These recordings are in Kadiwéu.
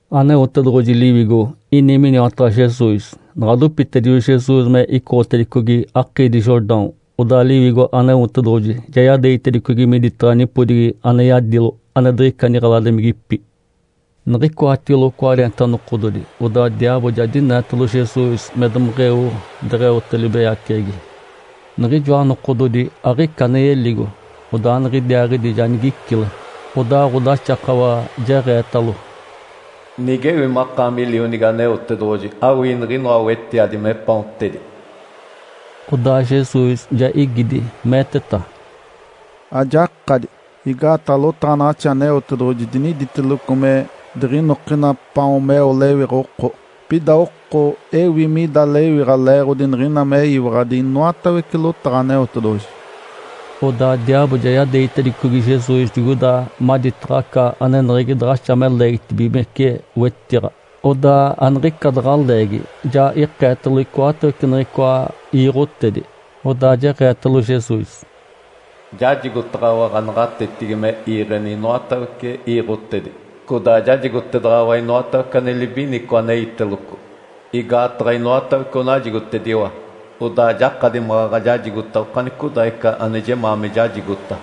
Aneotedoɡ̶oji Liwigo ini miniwataɡ̶a Jesus. Naɡ̶a dopitedijo Jesus me icoɡ̶otedicogi akiidi Jordão, odaa Liwigo Aneotedoɡ̶oji ja yadeegitedicogi miditaɡ̶a nipodigi ane yadilo, ane diɡ̶ica niɡ̶eladimigipi. Niɡ̶icoatigilo cwareenta nokododi, odaa diaabo ja dineetalo Jesus me domeɡ̶eo deɡ̶eote libeyaceɡ̶egi. Niɡ̶ijoa nokododi aɡ̶ica ane yeligo, odaa niɡ̶idiaaɡ̶idi ja nigicile. Odaa ɡ̶odaxakawa jeɡ̶eetalo, “Nigewi makaami Lionigi Aneotedoɡ̶oji, awii niɡ̶inoa wetiadi me paontedi.” Odaa Jesus ja igidi, meeteta, “Ajakadi, igaataɡ̶a lotaɡ̶anaɡ̶axi Aneotedoɡ̶oji diniditeloco me diɡ̶inokina paon meo lewiɡ̶a oko, pida oko ewi mida lewiɡ̶a leeɡ̶odi niɡ̶ina meyiwaɡ̶adi inoatawece lotaɡ̶a Aneotedoɡ̶oji.” Odaa diaabo ja yadeegitedicogi Jesus digoida maditaɡ̶a aca aneneɡ̶egi daɡ̶axa me leegitibigimece wetiɡ̶a. Odaa aniɡ̶ica daɡ̶a leegi, ja ikeetalo icoatawece niɡ̶icoa iiɡ̶otedi. Odaa jeɡ̶eetalo Jesus, “Jajigotaɡ̶awa ɡ̶anaɡ̶atetigi me iiɡ̶eni inoatawece iiɡ̶otedi, codaa jajigotedaɡ̶awa inoatawece ane libinico aneiteloco. Igaataɡ̶a inoatawece onajigotediwa, odaa jakadi maɡ̶aɡ̶a jajigota okanicodaaɡ̶ica ane jemaa me jajigota.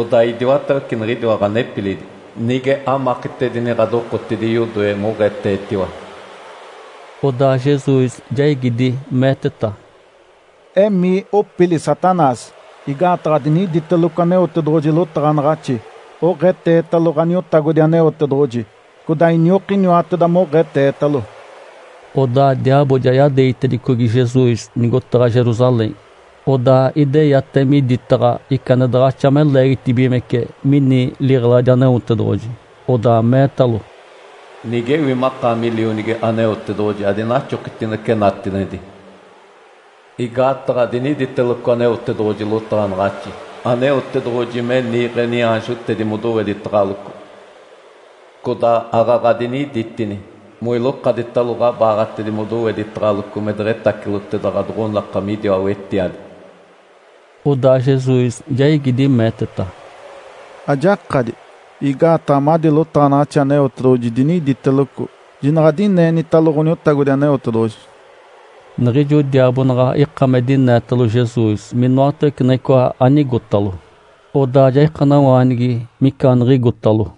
Odaa idiwatawece niɡ̶idiwa ɡ̶anepilidi, nige amakitedini ɡ̶adokotidi yodoe moɡ̶eetetiwa.” Odaa Jesus ja igidi, meeteta, “Emii opili Satanás! Igaataɡ̶a diniditeloco Aneotedoɡ̶oji lotaɡ̶anaɡ̶axi, ‘Oɡ̶eetetalo Ǥaniotagodi Aneotedoɡ̶oji, codaa iniokiniwateda moɡ̶eetetalo.’” Odaa diaabo ja yadeegitedicogi Jesus nigotaɡ̶a Jerusalém, odaa ideyate miditaɡ̶a ica ane daɡ̶axa me leegitibigimece mini liɡ̶eladi Aneotedoɡ̶oji, odaa meetalo, “Nigewi makaami Lionigi Aneotedoɡ̶oji, adinaxokitinece natinedi. Igaataɡ̶a diniditeloco Aneotedoɡ̶oji lotaɡ̶anaɡ̶axi, ‘Aneotedoɡ̶oji me niiɡ̶e niaanjotedi modoweditaɡ̶aloco’. Codaa aaɡ̶aɡ̶a diniditini, ‘Moilokaditalo ɡ̶abaaɡ̶atedi modoweditaɡ̶aloco me deɡ̶etaciloteda ɡ̶adoɡ̶onaka midiwa wetiadi.’” Odaa Jesus ja igidi, meeteta, “Ajakadi, igaataɡ̶a madi lotaɡ̶anaɡ̶axi Aneotedoɡ̶oji diniditeloco, ‘Jinaɡ̶a adineenitalo Ǥoniotagodi Aneotedoɡ̶oji.’” Niɡ̶ijo diaabo naɡ̶a ika me dineetalo Jesus minoatawece niɡ̶icoa anigotalo, odaa ja ikanawaanigi micaaniɡ̶igotalo.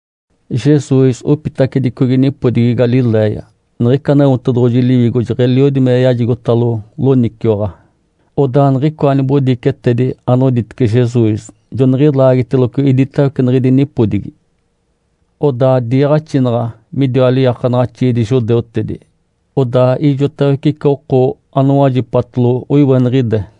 Jesus opitacedicogi nipodigi Galiléia, niɡ̶ica Aneotedoɡ̶oji Liwigo jeɡ̶eliodi me yajigotalo loniciwaɡ̶a. Odaa niɡ̶icoa nibodicetedi anoditece Jesus joniɡ̶ilaagiteloco iditawece niɡ̶idi nipodigi. Odaa diiɡ̶axinaɡ̶a midiwa liiakanaɡ̶axiidi judeutedi, odaa ijotawece ica oko anowajipatalo oiweniɡ̶ide.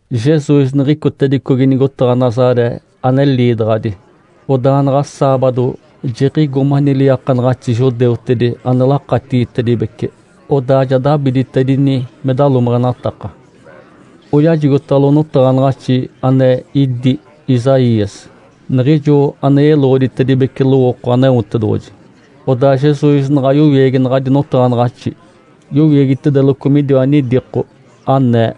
Jesus niɡ̶icotedicogi nigotaɡ̶a Nazaré ane liidaɡ̶adi. Odaa naɡ̶a saabado, jiɡ̶igo mani liiakanaɡ̶axi judeutedi ane lakatigitedibece. Odaa ja dabiditedini me dalomeɡ̶enataka. Oyajigotalo notaɡ̶anaɡ̶axi ane idí Isaías, niɡ̶ijo ane yeloɡ̶oditedibece lowooko Aneotedoɡ̶oji. Odaa Jesus naɡ̶a yowiegi naɡ̶adi notaɡ̶anaɡ̶axi, yowiegitedeloco midiwa nidiko anee,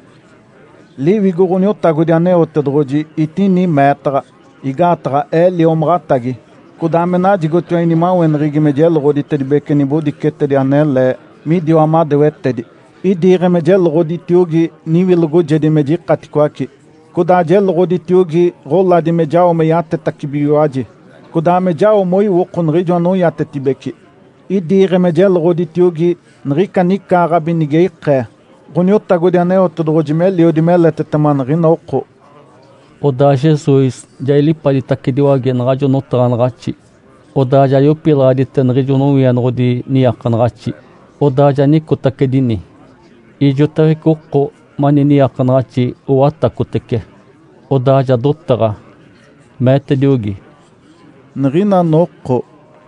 “Liwigo Ǥoniotagodi Aneotedoɡ̶oji etini meetaɡ̶a. Igaataɡ̶a ee liomaɡ̶atagi, codaa me najigotiwa inimaweneɡ̶egi me jeloɡ̶oditedibece nibodicetedi anele midiwa madewetedi. Idiiɡ̶e me jeloɡ̶oditiogi niwilogojedi me jikaticoace, codaa jeloɡ̶oditiogi ɡ̶oladi me jao me yatetacibigiwaji, codaa me jao moiwoko niɡ̶ijo anoiatetibeci. Idiiɡ̶e me jeloɡ̶oditiogi niɡ̶ica nicaaɡ̶abi nige ikee Ǥoniotagodi Aneotedoɡ̶oji meliodi meletetema niɡ̶ina oko.” Odaa Jesus ja ilipaditacediwage naɡ̶ajo notaɡ̶anaɡ̶axi, odaa ja yopilaɡ̶adite niɡ̶ijo nowienoɡ̶odi niiakanaɡ̶axi. Odaa ja nicotacedini. Ijotawece oko mani niiakanaɡ̶axi owatacotece. Odaa ja dotaɡ̶a, meetediogi, “Niɡ̶ina noko,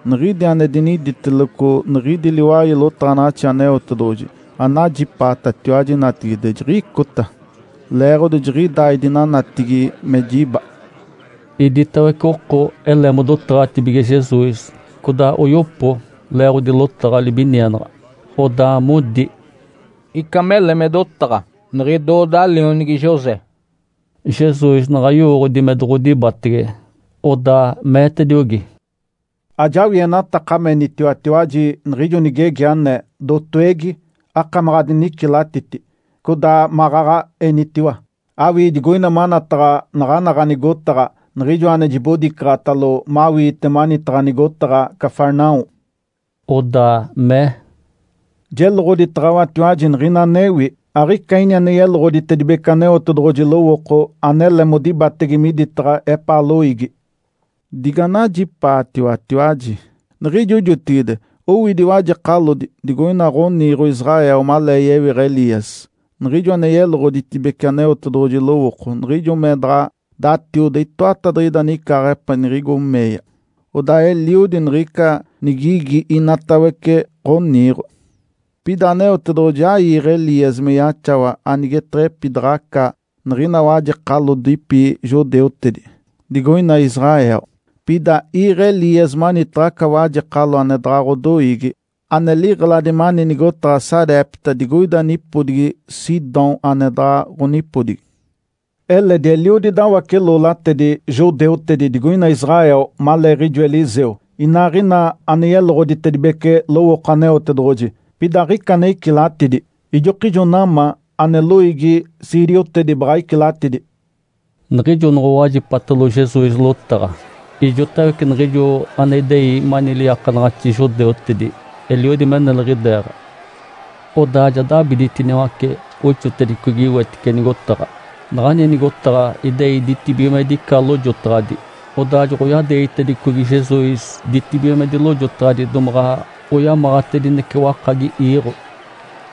niɡ̶idi ane diniditeloco niɡ̶idi liwai lotaɡ̶anaɡ̶axi Aneotedoɡ̶oji anajipaatatiwaji natigide, jiɡ̶icota. (Leeɡ̶odi jiɡ̶idaa idinanatigi me jiba.)” Iditawece oko ele modotaɡ̶atibige Jesus, codaa oyopo leeɡ̶odi lotaɡ̶a libinienaɡ̶a. Odaa modi, “Ica mele me dotaɡ̶a, niɡ̶idooda lionigi José!” (Jesus naɡ̶a yowooɡ̶odi me doɡ̶odibatege.) Odaa meetediogi, “Ajawienataka menitiwatiwaji niɡ̶ijo nigegi anee, ‘Dotowegi, akamaɡ̶a adinicilatiti!’ Codaa maɡ̶aɡ̶a enitiwa, ‘Awii digoina manataɡ̶a naɡ̶ana ɡ̶anigotaɡ̶a niɡ̶ijoa ane jibodicaɡ̶atalo mawiite manitaɡ̶a nigotaɡ̶a Cafarnaum.’” Odaa mee, “Jeloɡ̶oditaɡ̶awatiwaji niɡ̶ina anewi, aɡ̶ica ini ane yeloɡ̶oditedibece Aneotedoɡ̶oji lowooko anele modibatege miditaɡ̶a epaa loiigi. Diganajipaatiwatiwaji! Niɡ̶ijo jotigide owidi wajekalodi digoina ɡ̶oniiɡ̶o Israel malee yewiɡ̶a Elias, niɡ̶ijo ane yeloɡ̶oditibece Aneotedoɡ̶oji lowooko, niɡ̶ijo me daɡ̶a datiode itoatadiɡ̶ida nicaaɡ̶ape niɡ̶igo meeya. Odaa eliodi niɡ̶ica nigigi inatawece ɡ̶oniiɡ̶o. Pida Aneotedoɡ̶oji aiiɡ̶e Elias me yaxawa anigeteɡ̶epidaɡ̶aca niɡ̶ina wajekalodipi judeutedi, digoina Israel. Pida iiɡ̶e Elias manitaɡ̶a aca wajekalo ane daɡ̶a ɡ̶odoiigi, ane liɡ̶eladi mani nigotaɡ̶a Sarepta digoida nipodigi Sidom ane daɡ̶a ɡ̶onipodigi. Eledi eliodi dawace-loolatedi judeutedi digoina Israel maleeɡ̶ijo Eliseu, inaaɡ̶ina ane yeloɡ̶oditedibece lowooko Aneotedoɡ̶oji. Pida aɡ̶ica ane icilatidi. Ijokijo Naamã, ane loiigi siiriotedi, baɡ̶a icilatidi.” Niɡ̶ijo noɡ̶owajipatalo Jesus lotaɡ̶a, ijotawece niɡ̶ijo ane idei mani liiakanaɡ̶axi judeutedi eliodi me neliɡ̶ideeɡ̶a. Odaa ja dabiditiniwace oixigitedicogi wetice nigotaɡ̶a. Naɡ̶ani nigotaɡ̶a idei ditibigimedi ica lojotaɡ̶adi, odaa joɡ̶oyadeegitedicogi Jesus ditibigimedi lojotaɡ̶adi domaɡ̶a oyamaɡ̶atedinece wakagi iiɡ̶o.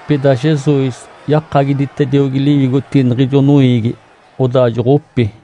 Pida Jesus yakagiditediogi liwigotigi niɡ̶ijo noiigi, odaa joɡ̶opi.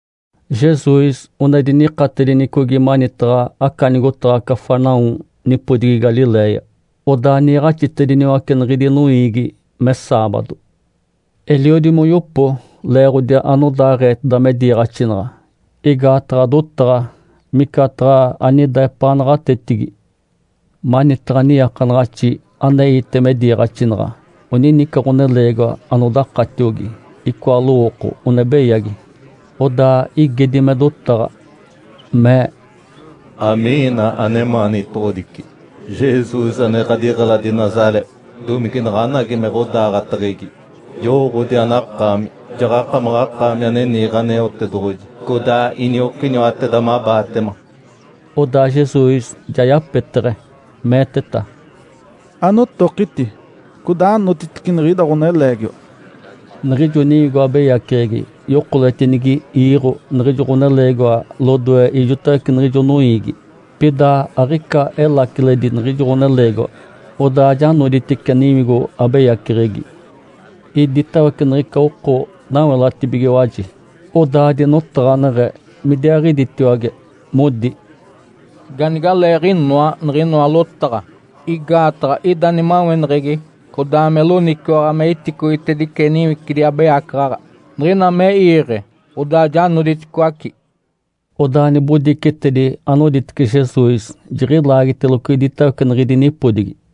Jesus one dinikatedinicogi manitaɡ̶a aca nigotaɡ̶a Cafarnaum nipodigi Galiléia. Odaa niiɡ̶axitediniwace niɡ̶idi noiigi me saabado. Eliodi moyopo leeɡ̶odi anodaaɡ̶eeteda me diiɡ̶axinaɡ̶a, igaataɡ̶a dotaɡ̶a micataɡ̶a anida epaa naɡ̶atetigi. Manitaɡ̶a niiakanaɡ̶axi aneite me diiɡ̶axinaɡ̶a onini ica ɡ̶oneleegiwa anodakatiogi, icoa lowooko one beyagi. Odaa igedi me dotaɡ̶a, mee, “Amiina anemaanitoɡ̶odici, Jesus ane ɡ̶adiɡ̶eladi Nazaré? Domige naɡ̶anagi me ɡ̶odaaɡ̶ateɡ̶egi? Jowooɡ̶odi anakaami! Jaɡ̶akamaɡ̶akaami ane niiɡ̶e Aneotedoɡ̶oji, codaa iniokiniwateda mabaatema.” Odaa Jesus ja yapeteɡ̶e, meeteta, “Anotokiti, codaa anotitice niɡ̶ida ɡ̶oneleegiwa!” Niɡ̶ijo niwigo abeyaceɡ̶egi yokoletinigi iiɡ̶o niɡ̶ijo ɡ̶oneleegiwa lodoe ijotawece niɡ̶ijo noiigi, pida aɡ̶ica elaciledi niɡ̶ijo ɡ̶oneleegiwa. Odaa ja noditice niwigo abeyaceɡ̶egi. Iditawece niɡ̶ica oko nawelatibigiwaji, odaa dinotaɡ̶aneɡ̶e midiaaɡ̶iditiwage, modi, “Ganigaaleeɡ̶inoa niɡ̶inoa lotaɡ̶a! Igaataɡ̶a ida nimaweneɡ̶egi codaa me loniciwaɡ̶a me iticoitedice niwicidi abeyacaɡ̶aɡ̶a. Niɡ̶ina me iiɡ̶e, odaa ja noditicoaci.” Odaa nibodicetedi anoditece Jesus jiɡ̶ilaagiteloco iditawece niɡ̶idi nipodigi.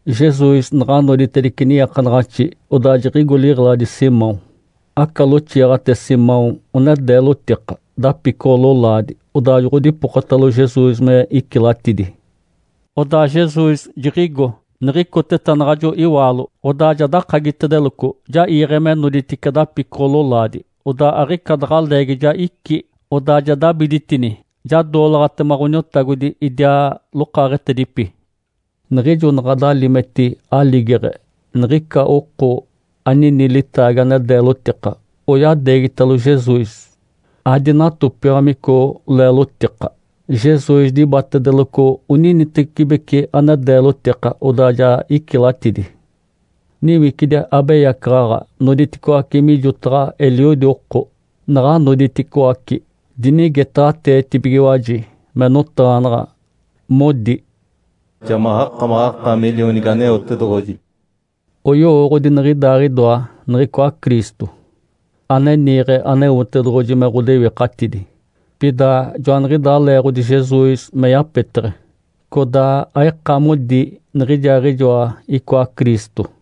Jesus naɡ̶a noditedice niiakanaɡ̶axi, odaa jiɡ̶igo liɡ̶eladi Simão. Aca loxiiɡ̶ate Simão one deelotika, dapicoɡ̶o-lolaadi. Odaa joɡ̶odipokotalo Jesus me icilatidi. Odaa Jesus jiɡ̶igo. Niɡ̶icoteta naɡ̶ajo iwaalo, odaa ja dakagitedeloco, ja iiɡ̶e me noditice dapicoɡ̶o-lolaadi. Odaa aɡ̶ica daɡ̶a leegi ja icí, odaa ja dabiditini, ja doolaɡ̶atema Ǥoniotagodi idiaa lokaaɡ̶etedipi. Niɡ̶ijo naɡ̶a dalimeti aligeɡ̶e, niɡ̶ica oko anini litaagi ane deelotika, oyadeegitalo Jesus. Adinatopiamico leelotika. Jesus dibatedeloco oninitecibeci ane deelotika, odaa ja icilatidi. Niwicidi abeyacaɡ̶aɡ̶a noditicoaci mijotaɡ̶a eliodi oko. Naɡ̶a noditicoaci, dinigetaɡ̶ateetibigiwaji me notaɡ̶anaɡ̶a, modi, “Ja makamaɡ̶akaami Lionigi Aneotedoɡ̶oji!” Oyowooɡ̶odi niɡ̶idaaɡ̶idoa niɡ̶icoa Cristo, ane niiɡ̶e Aneotedoɡ̶oji me ɡ̶odewikatidi. Pida joaniɡ̶idaa leeɡ̶odi Jesus me yapeteɡ̶e, codaa aika modi niɡ̶ijaaɡ̶ijoa icoa Cristo.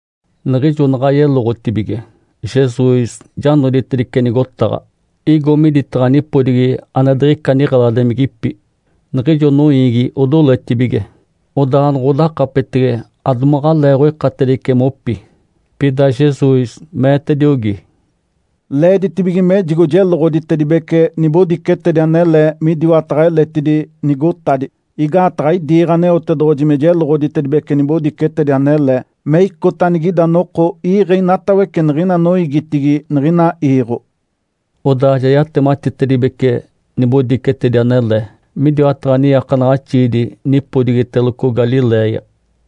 Niɡ̶ijo naɡ̶a yeloɡ̶otibige, Jesus ja noditedice nigotaɡ̶a, igo miditaɡ̶a nipodigi ane diɡ̶ica niɡ̶eladimigipi. Niɡ̶ijo noiigi odoletibige, odaa noɡ̶odakapetege, adomaɡ̶aleeɡ̶oikatedice mopi. Pida Jesus meetediogi, “Leeditibige mejigo jeloɡ̶oditedibece nibodicetedi anele midiwataɡ̶a eletidi nigotadi. Igaataɡ̶a idiiɡ̶e Aneotedoɡ̶oji me jeloɡ̶oditedibece nibodicetedi anele, me icota anigida noko iiɡ̶e inatawece niɡ̶ina noiigitigi niɡ̶ina iiɡ̶o.” Odaa ja yatematitedibece nibodicetedi anele midiwataɡ̶a niiakanaɡ̶axiidi nipodigiteloco Galiléia.